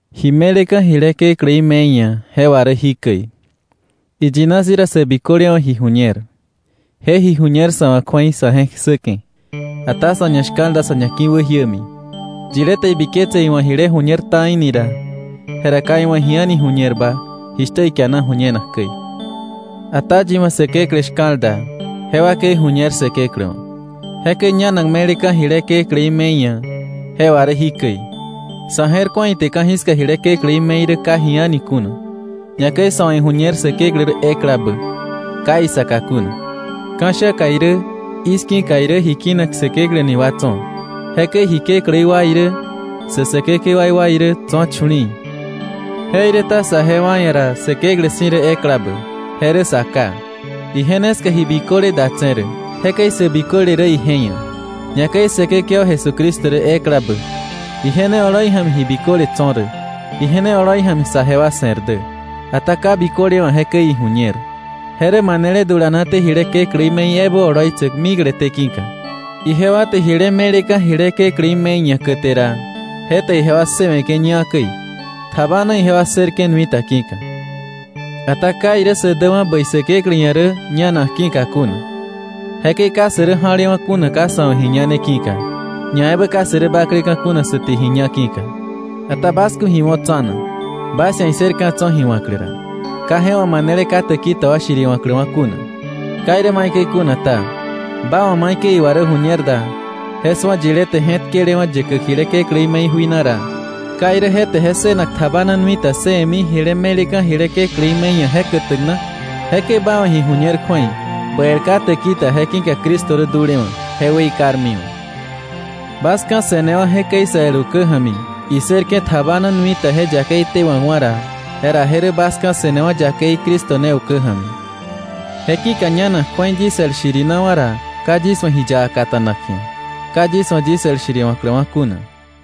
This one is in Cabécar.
Ji me̱leka̱ jile kekläí me̱i ia̱, je wà rä jikäi: Iyina si̱ ra sä biköle wa̱ ji ju̱ñer. Je ji ju̱ñer sa̱ wa̱ kju̱ei sa̱ je̱k ssäke̱. Ata sa̱ ñashka̱l da sa̱ ñaki̱wäjiämi. Yilé te ibiketse iwa̱ jile ju̱ñer ta̱i ni ra, jera ka iwa̱ ji a̱ni ju̱ñerba jishtä ikiana ju̱ñenak käi. Ata yi wa̱ Säkeklä shka̱l da, je wakei ju̱ñer Säkeklä wa̱. Jekäi ñanak me̱leka̱ jile kekläí me̱i ia̱, je wà rä jikäi: Sa̱ je̱r ku̱a ite ka̱jiska jile kekläí me̱i rä ka ji a̱ni kuna, ñakäi sa̱ wa̱ iju̱ñer Säkeklä rä eklabä, ka isaka kuna. Ka̱sha̱ka irä i̱ski̱ka irä ji kinak säkeklä ni wa tso̱. Jekäi ji kekläí wa irä, sä säkekewaí wa irä tso̱ chu̱li̱i̱, jeiräta saje wa ia̱ ra Säkeklä si̱ rä eklabä, je rä Sa Ká. Ije ne ska ji biköle datse̱ rä, jekäi sä biköle rä ije ia̱. Ñakäi Säkekewa Jesucristo rä eklabä. Ije ne oloi ja̱mi ji biköle tso̱ rä. Ije ne oloi ja̱mi saje wa se̱r dä. Ata ka biköle wa̱ jekäi iju̱ñer, je rä manele dulanaté jile kekläí me̱i ebä oloitsäk mikleté ki̱ka. Ijewa te jile me̱leka̱ jile kekläí me̱i ia̱ käte ra, je te ijewa ssëwe̱ke̱ ñá käi, tjabana ijewa ssërke̱ nui ta ki̱ka. Ata ka irä sä däwa̱ bäi Säkeklä ia̱ rä ñanak ki̱ka kuna. Jekäi ka sä rä ja̱lewa̱ kuna ka sa̱ wa̱ ji ñane ki̱ka, ñaebä ka sä rä bakleka̱ kuna sä te ji ña ki̱ka. Ata bas ku̱ ji wo̱ tsa̱na, bas ia̱ issër ka̱ tso̱ ji wa̱klä ra, ka je wa̱ manele ka täki ta wa shiriwa̱kläwa̱ kuna. Ka irä maikäi kuna ta, ba wa̱ maikäi iwa rä ju̱ñer da, je su̱a yilé te je̱tkelewa̱ yäkäk jile kekläí me̱i jui na ra, ¿ka irä je te je ssënak tjabana nui ta ssëwe̱mi jile me̱leka̱ jile kekläí me̱i ia̱ je kätäk na? Jekäi ba wa̱ ji ju̱ñer kju̱ei ba el ka täki ta je ki̱ka Cristo rä dulewa̱, je weikarmiwa̱. Bas ka̱se̱newa̱ jekäi sä el ukä ja̱mi, issërke̱ tjabana nui ta je yakei tewa̱kwa̱ ra, jera je rä bas ka̱se̱newa̱ yakei Cristo ne ukä ja̱mi. Je ki̱ka ñanak kju̱ei yis el shirinawa̱ ra, ka yis wa̱ ji yaka kata̱nak ji̱a, ka yis wa̱ yis el shiriwa̱kläwa̱ kuna.